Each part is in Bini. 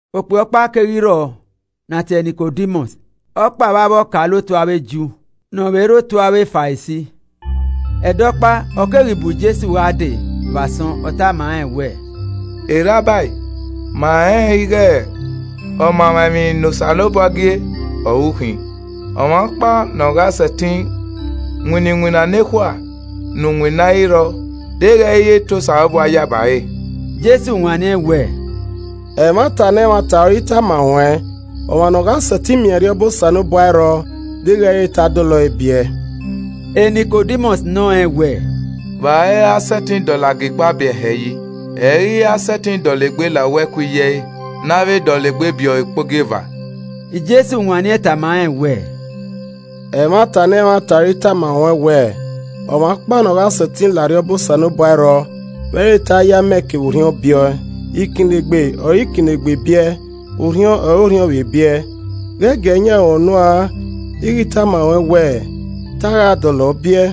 Okpia ọkpa keghi rrọọ ne a tie ẹre Nikodimọs, ọkpa vbe avbe ọkaolotu avbe Ju, ne ọ vbe rre otu avbe Farisi. Ẹdẹ ọkpa, ọ keghi bu Jesu gha dee vbe asọn, ọ tama rẹn wẹẹ, “Rabai, ma rẹnrẹn ighe ọmamwaemwi ne Osanobua gie ọre u khin. Ọmwa ọkpa ne ọ gha sẹtin winna iwinna nekhua ne u winna i rrọọ deghẹ i re to Osanobua yaba ẹre.” Jesu wanniẹn wẹẹ, “Ẹmwata ne ẹmwata ọre I tama ruẹn, ọmwa ne ọ gha sẹtin miẹn Arriọba Osanobua ẹ i rrọọ deghẹ i re te a dọlọ ẹe biẹ.” Nikodimọs nọ rẹn wẹẹ, “Vbe a ra sẹtin dọlọ agikpa biẹ hẹẹ yi? Ẹ i ghi ra sẹtin dọlegbe la uwu ẹko iye ẹe ne a vbe dọlegbe biẹ ọe ukpogieva.” Jesu wanniẹn tama rẹn wẹẹ, “Ẹmwata ne ẹmwata ọre I tama ruẹn wẹ ọmwa ọkpa ne ọ gha sẹtin la Arriọba Osanobua ẹ i rrọọ vbe i re te a ye amẹ kevbe Orhiọn biẹ ọe. Ikinnegbe ọre ikinnegbe biẹ, orhiọn ọre Orhiọn vbe biẹ. Ghẹ giee yan ruẹn unu an ighe I tama ruẹn wẹẹ, ‘Ta a gha dọlọ ọ biẹ.’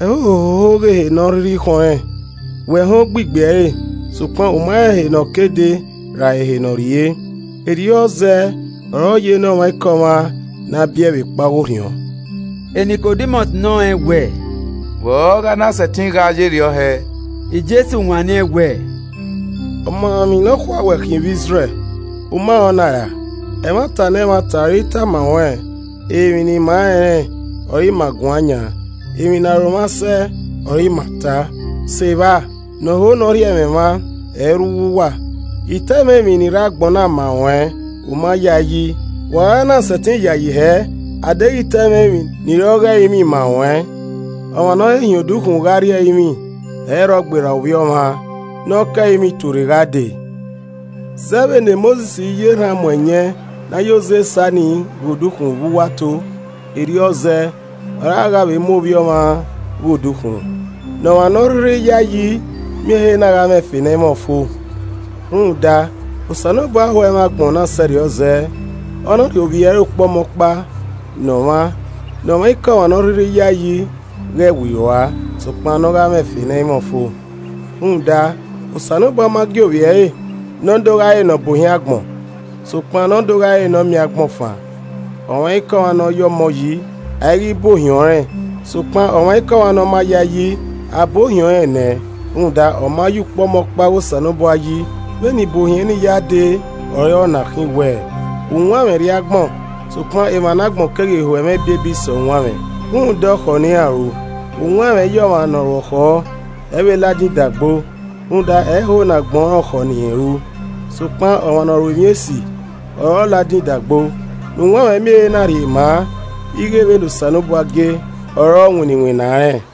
Ẹhoho hoho ghe ehe ne ọ rhirhi khọn rẹn, wẹ họn ogbigbi ẹre, sokpan u ma rẹn ehe ne ọ ke dee ra ehe ne ọ rrrie. Erriọ zẹẹ ọre ọ ye ne ọmwaikọmwa ne a biẹe vbe kpa ọghe Orhiọn.” Nikodimọs nọ rẹn wẹẹ, “Vbe ọ gha na sẹtin gha yerriọ hẹe?” Jesu wanniẹn wẹẹ, “Ọmamwaemwi nọkhua wẹ khin vbe Izrẹl, u ma rẹn ọna ra? Ẹmwata ne ẹmwata ọre I tama ruẹn, emwi ne ima rẹnrẹn ọre ima guan yan, emwi ne aro mwa sẹ ọ re ima ta, sevba, ne ọ ho ne ọ rhie ẹmwẹ mwa, ẹ i rre uwu uwa. I ta ẹmwẹ emwi ni rre agbọn na ma ruẹn u ma yayi, vbe u ra na sẹtin yayi hẹ a deghẹ I ta ẹmwẹ emwi ni re ọghe ẹrinmwi ma ruẹn. Ọmwa ne ọ he hin odukhunmwu gha rrie ẹrinmwi ẹ i rrọọ gberra Ovbi Ọmwa ne ọ ke ẹrinmwi tuorre gha dee.” Zẹ vbene Mosis ya erhan mu ẹyẹn ne a ya oze sa ni ghe odukhunmwu vbe uwu ato, erriọ zẹ ọre a gha vbe mu Ovbi Ọmwa ghe odukhunmwu. Ne ọmwa ne ọ rhirhi yae yi miẹn ehe na gha mwẹ ẹfe ne ẹ i mwẹ ọfo. Rhunmwuda Osanobua ho ẹmwẹ agbọn na sẹrriọ zẹẹ ọ na rhie Ovbi ẹre ukpọmọkpa ne ọmwa, ne ọmwaikọmwa ne ọ rhirhi ya ẹe yi ghẹ wirua, sokpan ne ọ gha mwẹ ẹfe ne ẹ i mwẹ ọfo. Rhunmwuda Osanobua ma gie Ovbi ẹre ne ọ do gha re ne ọ bu ohiẹn agbọn, sokpan ne ọ do gha re ne ọ miẹn agbọn fan. Ọmwaikọmwa ne ọ ya ọmọ yi, a i ghi bu ohiẹn ọnrẹn sokpan ọmwaikọmwa ne ọ ma ya ẹe yi, a bu ohiẹn ọnrẹn nẹ rhunmwuda ọ ma ya ukpọmọkpa ọghe Osanobua yi. Vbene ibuohiẹn ni ya de ọre ọ na khin wẹẹ: Uwanmwẹ rrie agbọn, sokpan emwa ne agbọn keghi ho ẹmwẹ ebiebi sẹ uwanmwẹ rhunmwuda ọkhọ ne iran ru. Uwanmwẹ i yẹ ọmwa ne ọ ru ọkhọ, ẹ i vbe ladian idagbo, rhunmwuda ẹ i ho ne agbọn rẹn ọkhọ ne irẹn ru. Sokpan ọmwa ne ọ ru emwi esi ọre ọ ladian idagbo ne uwanmwẹ miẹn ehe na rhie ma ighe vbene Osanobua gie ọre ọ winna iwinna rẹn.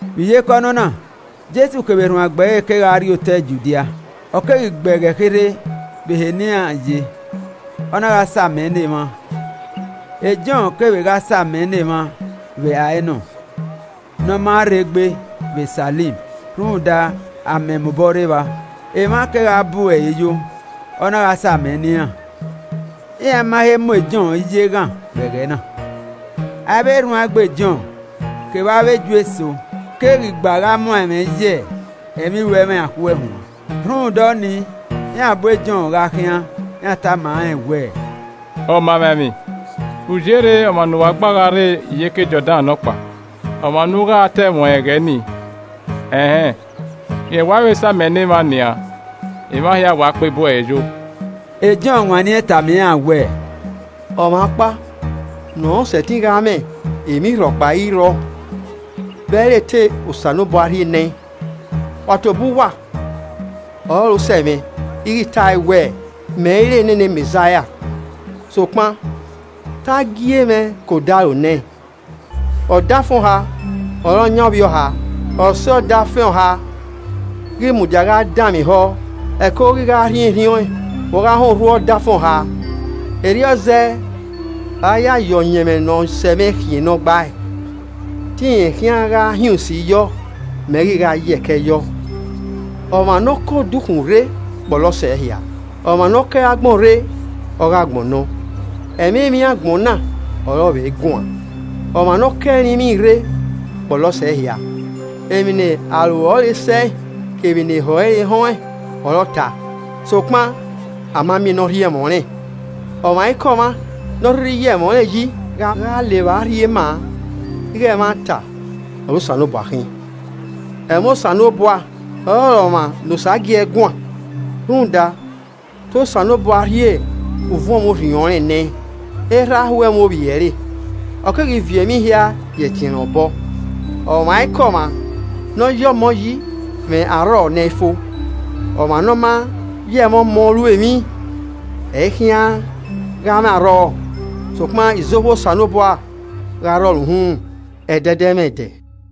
Vbe iyeke ọnọna, Jesu kevbe erhuanegbe ẹre kegha rrie otọe Judia. Ọ keghi gbe ẹghẹ kherhe vbe ehe ne iran ye, ọ na gha sa amẹ ne emwa. Jọn kevbe gha sa amẹ ne emwa vbe Aenọn ne ọ ma rrei gbe vbe Salim rhunmwuda amẹ mobọ rre evba. Emwa kegha bu ẹre yo, ọ na gha sa amẹ ne iran. ( Iran ma he mu Jọn ye eghan vbe ẹghẹ na.) Avbe erhuanegbe Jọn kevbe avbe Ju eso keghi gba gha muan ẹmwẹ ye ẹmwẹ iruemwi a khue huan. Rhunmwuda ọnii, iran bu Jọn gha khian iran tama rẹn wẹ, “Ọmamwaemwi, u yerre ọmwa ne uwa gba gha rre iyeke Jọdan nọkpa, ọmwa ne u gha ta ẹmwẹ ọnrẹn ẹghẹ nii? Ẹn hẹn, rẹn wa vbe sa amẹ ne emwa nian, emwa hia wa kpe bu ẹre yo!” Jọn wanniẹn tama iran wẹẹ, “Ọmwa ọkpa ne ọ sẹtin gha mwẹ emwi rhọkpa i rrọọ vbe ẹ i re te Osanobua rhie nẹẹn. Wa tobọ uwa ọrọre osẹe mwẹ ighe I tae wẹẹ, ‘Mẹ i re nene Mẹzaia, sokpan te a gie mwẹ ke odaro nẹẹn!’ Ọdafẹn ọha ọre ọ yan ovbiọha. Ọse ọdafẹn ọha ghi mudia gha danmwehọ, ẹko ghi gha rhiẹnrhiẹn ọẹn vbe ọ gha họn urhu ọdafẹn ọha. Erriọ zẹẹ ọre a ya ye ọyẹnmwẹ ne ọ sẹmwẹ khian ne ọ gbae. Te irẹn khian gha hin usi yọ, mẹ ghi gha yẹkẹ yọ.” Ọmwa ne ọ ke odukhunmwu rre kpọlọ sẹ ehia, ọmwa ne ọ ke agbọn rre, ọghe agbọn nọ, ẹmwẹ emwi agbọn na ọre ọ vbe guan. Ọmwa ne ọ ke ẹrinmwi rre kpọlọ sẹ ehia. Emwi ne aro ẹre sẹe kevbe ne ehọ ẹre họn ẹn ọre ọ ta sokpan a ma miẹn ne ọ rhie ẹmwẹ ọnrẹn. Ọmwaikọmwa ne ọ rhirhi ya ẹmwẹ ọnrẹn yi gha la evba rhie ma ighe ẹmwata ọre Osanobua khin. Ẹmwẹ Osanobua, ọre ọmwa ne Osa gie guan rhunmwuda te Osanobua rhie uvuọnmwẹ Orhiọn rẹn nẹẹn. Erha ho ẹmwẹ Ovbi ẹre, ọ keghi viọ emwi hia ye ẹtin ẹnrẹn obọ. Ọmwaikọmwa ne ọ ya ọmọ yi mwẹ arrọọ ne ẹ i fo, ọmwa ne ọ ma ya ẹmwẹ Ọmọ ru emwi, ẹ i khian gha mwẹ arrọọ, sokpan izohu Osanobua gha rrọọ ẹre uhunmwu ẹdẹdẹmwẹdẹ.